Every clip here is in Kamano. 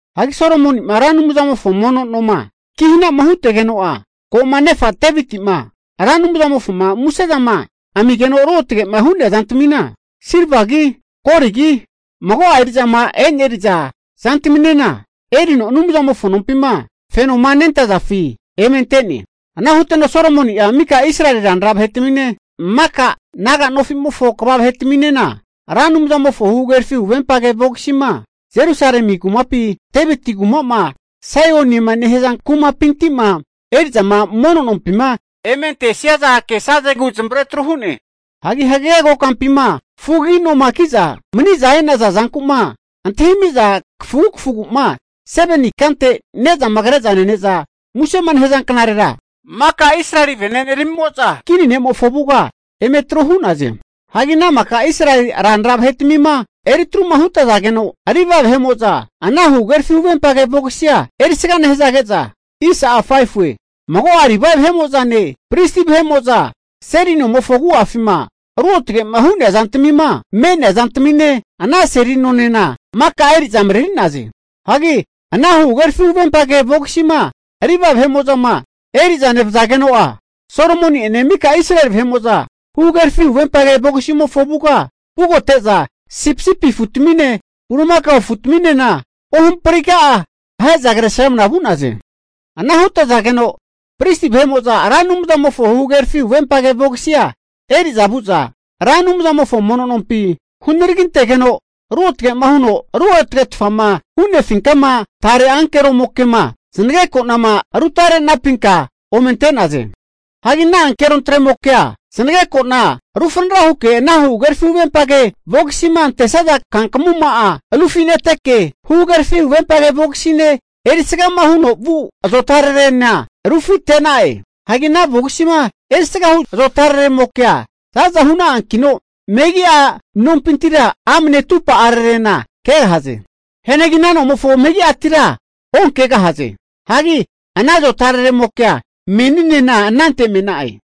Hagi Solomoni'ma Ra Anumzamofo mono noma kihanama huntegeno'a, ko'ma nefa Deviti'ma Ra Anumzamofoma musezama amigeno ruotage'ma hu'nea zantamina, silvagi, goligi, mago'a eri'zama e'neri'za zantaminena erino Anumzamofo nompima fenoma nentazafi eme ante'ne. Ana huteno Solomoni'a mika Israeli ranra vahetamine, maka naga nofimofo kva vahetaminena, Ra Anumzamofo huhagerafi huvempage vogisima, Jerusalemi kumaku'ma Deviti kuma Saionema nehaza kumapinti'ma eri'za mareri'za mono nompima eme antesazegu zamavare atru hu'ne. Hagi hagege kokampima fugagi noma ki'za mani'za e'naza zanku'ma antahimi'za kafugu kafuguma 7ni ikante, ne'zama kre'za nene'za musema nehaza knarera maka Israeli vene'neramimo'za kini ne'mofo avuga eme atru hu'naze. Hagi ana maka Israeli ranra vahetmima etruma hutazageno, Livae vahe'mo'za ana huhagerafi huvempage vogisia erisga nehazage'za, mago'a Livae vahe'mo'zane pristi vahe'mo'za Seli nomofo agu'afima ruotge'ma hu zantmima me'nea zantamine, ana seli nonena maka eri'za mareri'naze. Hagi ana huhagerafi huvempage vogisima Livae vahe'mo'zama eri'za nevazageno'a, Solomoni'ene mika Israeli vahe'mo'za huhagerafi huvempage vogisimofo avuga vugote'za sipisipi afutamine, bulimakao afutaminena ohampriga'a ahe'za kresramna vu'naze. Ana hutazageno pristi vahe'mo'za Ra Anumzamofo huhagerafi huvempage vogisia eri'za vu'za, Ra Anumzamofo mono nompi hunaragintegeno ruotge'ma huno ruotagetfama hu'nefinkama tare ankeromoke'ma zanageko'nama rutare'nampinka ome ante'naze. Hagi ana tare ankerontremokea zanageko'na rufanara huke ana huhagerafi huvempage vogisima antesaza kankamuma'a rufineteke, huhagerafi huvempage vogisine erisgama huno vu azotararena rufite'na'e. Hagi ana vogisima erisgahu zota'araremokea za'za hu'na'ankino, megi'a nompintira amne atumpa'ararena kegahaze. Hianagi ana nomofo megi'atira onkegahaze. Hagi ana zotararemokea meninena anante me'na'e.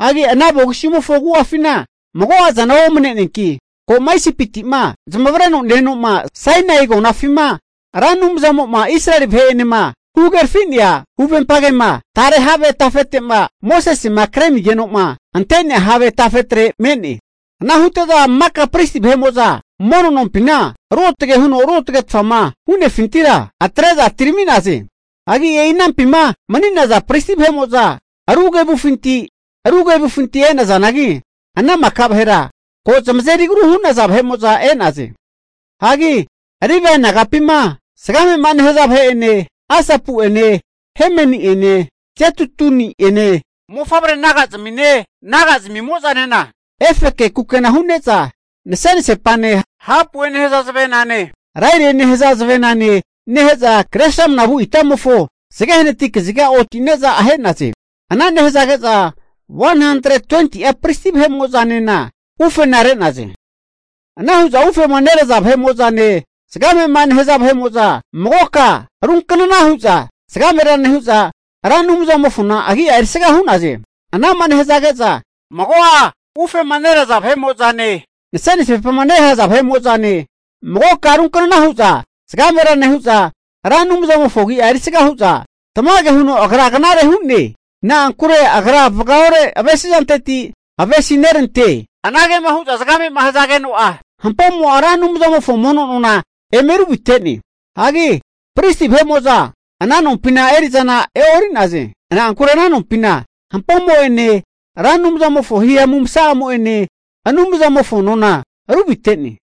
Hagi ana vogisimofo agu'afina mago'azana omne'neanki, ko'ma Isipiti'ma zamavareno ne-eno'ma Sainai agonafima Ra Anumzamo'ma Israeli vahe'enema huhagerafi'nea huvempagema tare have tafete'ma Mosesema kremigeno'ma ante'nea have tafetre me'ne. Ana hute'za maka pristi vahe'mo'za mono nompima ruotage huno ruotagetfama hu'nefintira atre'za atirami'naze. Hagi e'i anampima mani'naza pristi vahe'mo'za ru kevufinti ru kevufinti e'nazanagi, ana maka vahera ko' zamazeri agru hu'naza vahe'mo'za e'naze. Hagi Livae nagapima zagamema nehaza vahe'ene, Asapu'ene Hemeni'ene Jedutuni'ene mofavre naga'zmine, naga'zamimo'zanena efeke kukena hu'ne'za nasenasepane hapue nehaza zavenane, Lairie nehaza zavena nehe'za kresrama vu itamofo zage hanati kaziga oti'naze. Ana nehazage'za 120'a pristi vahe'mo'zanena ufena re'naze. Ana hu'za ufema neraza vahe'mo'zane zagamema nehaza vahe'mo'za magoka runknana hu'za zagamera nehu'za, Ra Anumzamofona agi'a erisga hu'naze. Anama nehazage'za mago'a ufema neraza vahe'mo'zane, nase'nasepama nehaza vahe'mo'zane, magoka ruknana hu'za zagamera nehu'za Ra Anumzamofona agi'a erisga hu'za, tamage huno Agra knare hu'ne. Na'ankure Agra vagaore avesizanteti avesi nerante. Anagema hu'za zagame'ma hazageno'a, hampomo'a Ra Anumzamofo mono nona eme ruvite'ne. Hagi pristi vahe'mo'za ana nompina eri'zana e'ori'naze. Na'ankure ana nompina hampomo'ene Ra Anumzamofo himamu masa'amo'ene Anumzamofo mono nona ru vite'ne.